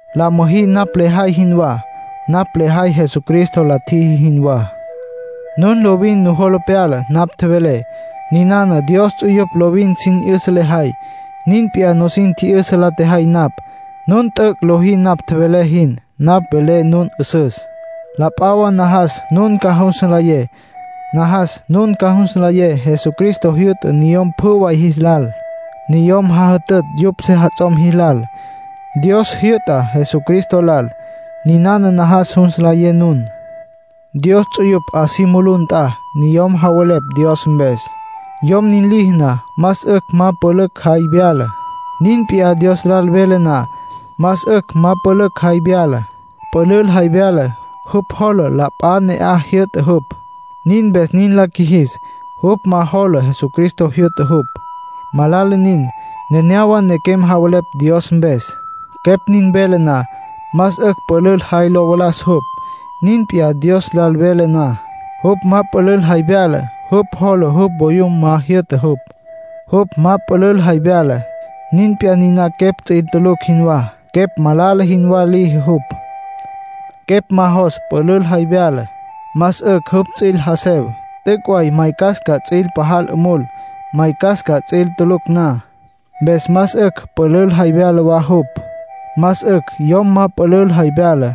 La müjí napj lejay jinwá. Napj lejay Jesucristo la tjiji jinwá. Nun lovin nujola pyala napj tjevelé. Ninana Dios ts'uyupj lovin sin 'yüsa lajay, nin p'iyá nusin tji'yüsa la tjejay napj. Nun t'üc' lojí napj tjevelé jin. Napj velé nun 'üsüs. La p'a wa najas nun ca jus nlayé. Najas nun ca jus nlayé Jesucristo jyü'ta niyom pjü way jilal. Niyom jajütütj yupj sejats'om jilal. Dios jyü'ta Jesucristo lal. Niná najas jus nlayé nun. Dios ts'uyupj 'a si mulú nt'a, niyom javelepj Dios mpes. Yom nin liji na, más 'ücj ma pülül jay vyala. Nin p'iyá Dios lal vele na. Más 'ücj ma pülül jay vyala. Pülül jay vyala, jupj jola la p'a ne'aj jyü'ta jupj. Nin mpes nin la qjuijis. Jupj ma jola Jesucristo jyü'ta jupj. Malala nin. Nenéyawa nequem javelepj Dios mpes. Quepj nin vele na, más 'ücj pülül jay lo valas jupj. Nin p'iyá Dios lal vele na. Jupj ma pülül jay vyala, jupj jola jupj voyum ma jyü'ta jupj. Jupj ma pülül jay vyala, nin p'iyá niná quepj ts'üil tulucj jinwá. Quepj malala jinwá liji jupj. Quepj ma jos pülül jay vyala, más 'ücj jupj ts'üil jasev. T'üc' way maycas ca ts'üil pajal 'umul, maycas ca ts'üil tulucj na, mpes más 'ücj pülül jay vyala wa jupj. Más 'ücj yom ma pülül jay vyala;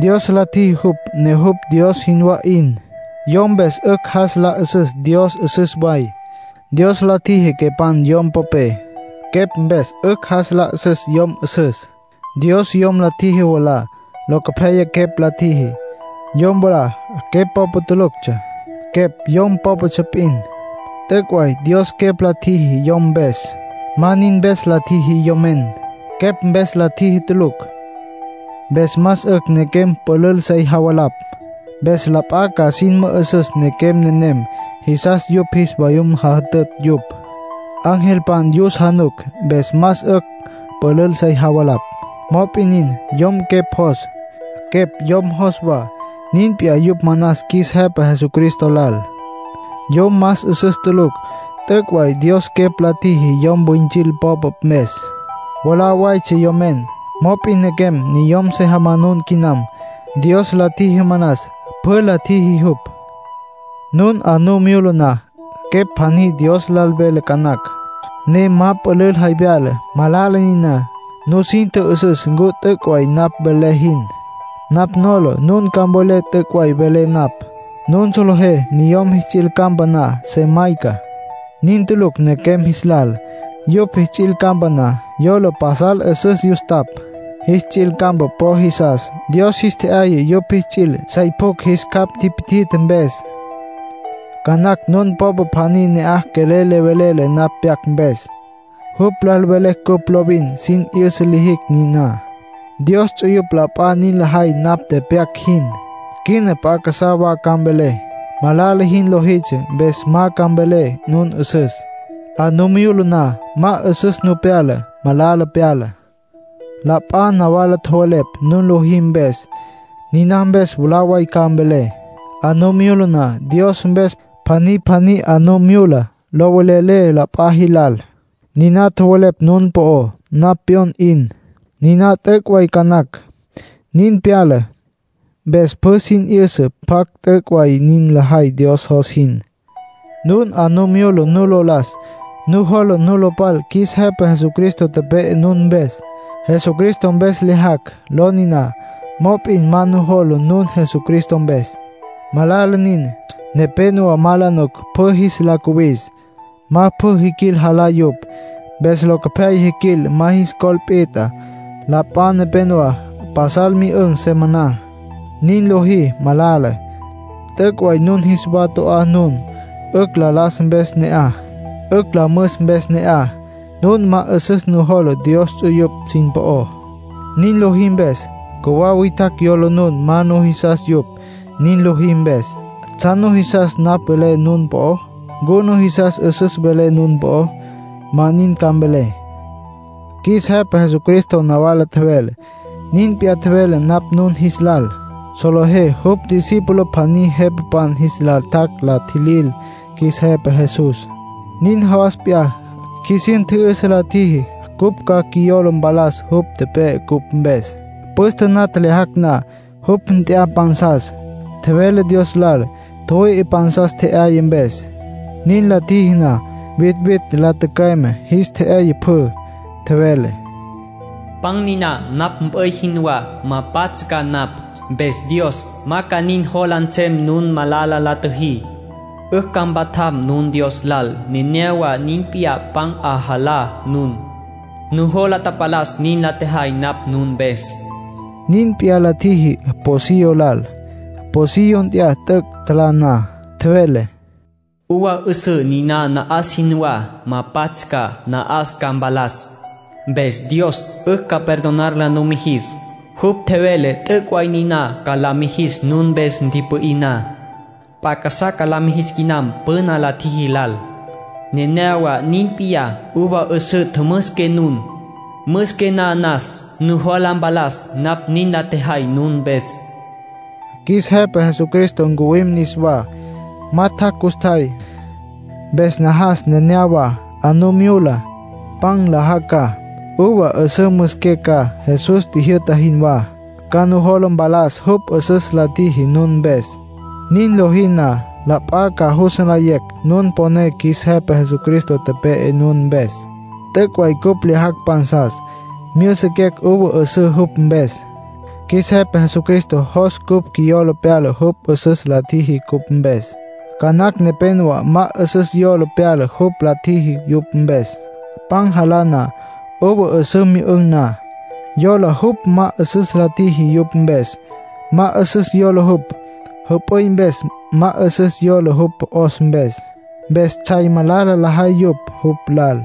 Dios la tjiji jupj, ne jupj Dios jinwá 'in. Yom mpes 'ücj jas la 'üsüs Dios 'üsüs way. Dios la tjiji quepan yom popé. Quepj mpes 'ücj jas la 'üsüs yom 'üsüs. Dios yom la tjiji mwalá. Locopyaya quepj la tjiji. Yom mwalá quepj popa tuluctsja; quepj yom pópatsja p'in. T'üc' way Dios quepj la tjiji yom mpes. Ma nin mpes la tjiji yomen; quepj mpes la tjiji tulucj. Mpes más 'ücj nequem pülül sey javalapj. Mpes la p'a ca sin mü'üsüs nequem nenem jisas yupj jis vayum jajütütj yupj. Angelpan yus januc, mpes más 'ücj pülül sey javalapj. Mop'in nin, yom quepj jos, quepj yom jos wa. Nin p'iyá yupj manas qjuis Jepa Jesucristo lal. Yom más 'üsüs tulucj. T'üc' way Dios quepj la tjiji yom wüintsil popa mpes. Mwalá waytsja yomen. Mop'in nequem niyom se jamanun quinam. Dios la tjiji manas. Pjü la tjiji jupj. Nun 'a nu myula na, quepj pjaní Dios lal vele ca nacj, ne ma pülül jay vyala. Malala niná. Nusin tjü'üsüs ncu t'üc' way napj velé jin. Napj nola nun ca mvelé t'üc' way velé napj. Nun solejé niyom jis ts'il campa na, se mayca. Nin tulucj nequem jis lal. Yupj jis ts'il campa na, yola pasal 'üsüs yustapj. Jis ts'il campa po jisas. Dios jis tje'yaya yupj jis ts'il, sey pjucj jis capj tipi'tje mpes. Ca nacj nun popa pjaní ne'aj quelel le velele napj pyac mpes. Jupj lal velé cupj lovin sin 'yüsa lijicj niná. Dios ts'uyupj la p'a nin lajay napj tepyac jin. Quina p'a casá wa ca mvelé. Malala jin lojitsja mpes ma ca mvelé nun 'üsüs. 'A nu myula na, ma 'üsüs nu pyala. Malala pyala. La p'a nawala tjowelepj nun lojí mpes. Niná mpes, mwalá way ca mvelé. 'A nu myula na Dios mpes, pjaní pjaní 'a nu myula, lo velelé la p'a jilal. Niná tjowelepj nun po'ó, napj pyon 'in. Niná t'üc' way ca nacj. Nin pyala, mpes pjü sin 'yüsa pjacj t'üc' way nin lajay Dios jos jin. Nun 'a nu myula nu lo las, nujola nu lo pal qjuis Jepa Jesucristo tepe'e nun mpes. “Jesucristo Mpes Lyajacj” ló niná. Mop'in ma nujola nun Jesucristo mpes; malala nin. Nepénowa ma la nuc pjü jis la cuwis. Ma pjü tjiquil, jalá yupj. Mpes locopyaya tjiquil ma jis col pit'a. La p'a nepenowá pasal myü'ün̈, se maná. Nin lojí malala. T'üc' way nun jis wa to'á nun, 'ücj la las mpes ne'aj, 'ücj la müs mpes ne'aj. Nun ma 'üsüs nujola Dios ts'uyupj sin po'ó, nin lojí mpes. Cjuwá witjacj yola nun ma nujisas yupj, nin lojí mpes. ¿Tsjan nujisas napj velé nun po'ó? ¿Ncu nujisas 'üsüs velé nun po'ó? Ma nin ca mvelé. Qjuis Jepa Jesucristo nawala tjevele, nin p'iyá tjevelé napj nun jis lal. Solejé jupj discípulo pjaní jepapan jis lal tjac' la tjilil qjuis Jepa Jesús. Nin jawas p'iyá, qjuisin tji'yüsa la tjiji cupj ca qjuiyola mpalas jupj tepe'e cupj mpes. Püste na tjelyajacj na, jupj nt'ya pansas. Tjevele Dios lal tjüwüi'i pan tje'yaya mpes. Nin la tjiji na, vitvitj la tücüeme, jis tje'yaya pjü. Tjevele: “Pan niná napj mp'üy jinwá. Ma pats' ca napj, mpes Dios ma ca nin jola nsem nun malala la tjüjí. 'Ücj ca mpatjaqué nun Dios lal. Nenéyawa nin p'iyá pan 'alajá nun, nujola tapalas nin la tjejay napj nun mpes.” Nin p'iyá la tjiji pocillo lal. Pocillo nt'ya t'üc' tjalá na. Tjevele: “Uva 'üsǘ niná na'as jinwá. Ma pats' ca, na'as ca mpalas. Mpes Dios 'ücj ca perdonar la numijis. Jupj tjevele t'üc' way niná ca la mijis nun mpes ntipü'í na. P'a casá ca la mijis quinam püna la tjiji lal. Nenéyawa nin p'iyá uva 'üsǘ tjümüsiqué nun. Müsiqué na najas nujola mpalas napj nin la tjejay nun mpes”, nin tjevele jupj. Qjuis Jepa Jesucristo ncuwim niswá. Ma tjac' custjay, mpes najas nenéyawa 'a nu myula, pan nlajá ca, uva 'üsǘ müsiqué ca, Jesús tjijyü'ta jinwá. Ca nujola mpalas jupj 'üsüs la tjiji nun mpes. Nin lojí na, la p'a ca jus nlayecj nun poné qjuis Jepa Jesucristo tepe'e nun mpes. T'üc' way cupj lyajacj pansas, myüsiquecj uva 'üsǘ jupj mpes. Qjuis Jepa Jesucristo jos cupj quiyola pyala jupj 'üsüs la tjiji cupj mpes. Ca nacj nepénowa ma 'üsüs yola pyala jupj la tjiji yupj mpes, pan jalá na, uva 'üsǘ myü'ün̈ na. Yola jupj ma 'üsüs la tjiji yupj mpes. Ma 'üsüs yola jupj jüp'üy mpes, ma 'üsüs yola jupj 'os mpes; mpes tsjay malala lajay yupj jupj lal.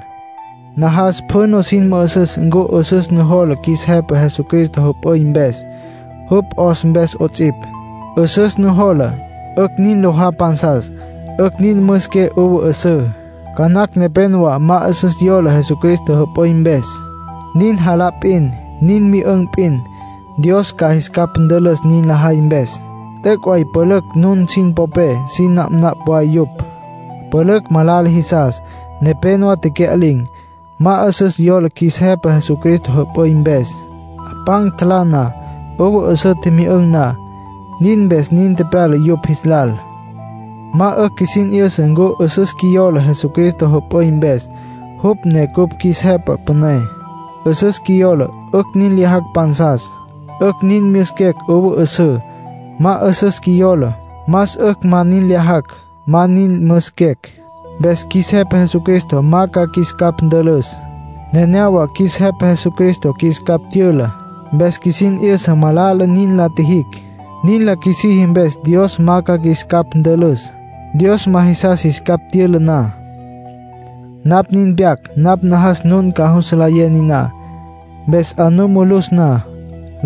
Najas pjü nusin mü'üsüs ncu 'üsüs nujola qjuis Jepa Jesucristo jüp'üy mpes, jupj 'os mpes 'ots'ipj. 'Üsüs nujola, 'ücj nin lojá pansas, 'ücj nin müsiqué uva 'üsǘ. Ca nacj nepénowa ma 'üsüs yola Jesucristo jüp'üy mpes. Nin jalá p'in, nin myü'ün̈ p'in. Dios ca jis capj ntülüs nin lajay mpes. T'üc' way pülücj nun sin popé sin napnapj way yupj. Pülücj malala jisas. Nepénowa tecya'lin̈. Ma 'üsüs yólatsja qjuis Jepa Jesucristo jüp'üy mpes, pan tjalá na, uva 'üsǘ tjimyü'ün̈ na; nin mpes nin tepyala yupj jis lal. Más 'ücj qjuisin 'yüsa ncu 'üsüs qjuiyola Jesucristo jüp'üy mpes, jupj ne cupj qjuis Jepa Püné. 'Üsüs qjuiyola, 'ücj nin lyajacj pansas, 'ücj nin myüsiquecj uva 'üsǘ. Ma 'üsüs qjuiyola, más 'ücj ma nin lyajacj, ma nin myüsiquecj. Mpes qjuis Jepa Jesucristo ma ca qjuis capj ntülüs. Nenéyawa qjuis Jepa Jesucristo qjuis capj tyüla. Mpes qjuisin 'yüsa malala nin la tjijicj. Nin la qjuisiji mpes Dios ma ca qjuis capj ntülüs, Dios ma jisas jis capj tyüla na. Napj nin tepyac napj najas nun ca jus nlayé niná. Mpes 'a nu mulus na,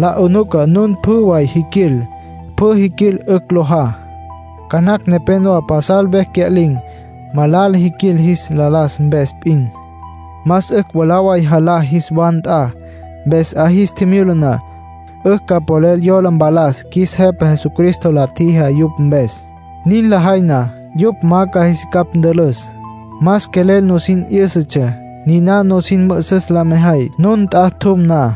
la 'unuca nun pjü way jiquil. Pjü tjiquil, 'ücj lojá. Ca nacj nepénowa pasal vecj cya'lin̈. Malala jiquil jis la las mpes p'in. Más 'ücj mwalá way jalá jis wa nt'a. Mpes 'a jis tjimyula na, 'ücj ca polel yola mpalas qjuis Jepa Jesucristo la tjijá yupj mpes. Nin lajay na, jupj ma ca jis capj ntülüs. Más quelel nusin 'yǘsatsja. Niná nusin mü'üsüs la mejay, nun nt'a tjum na.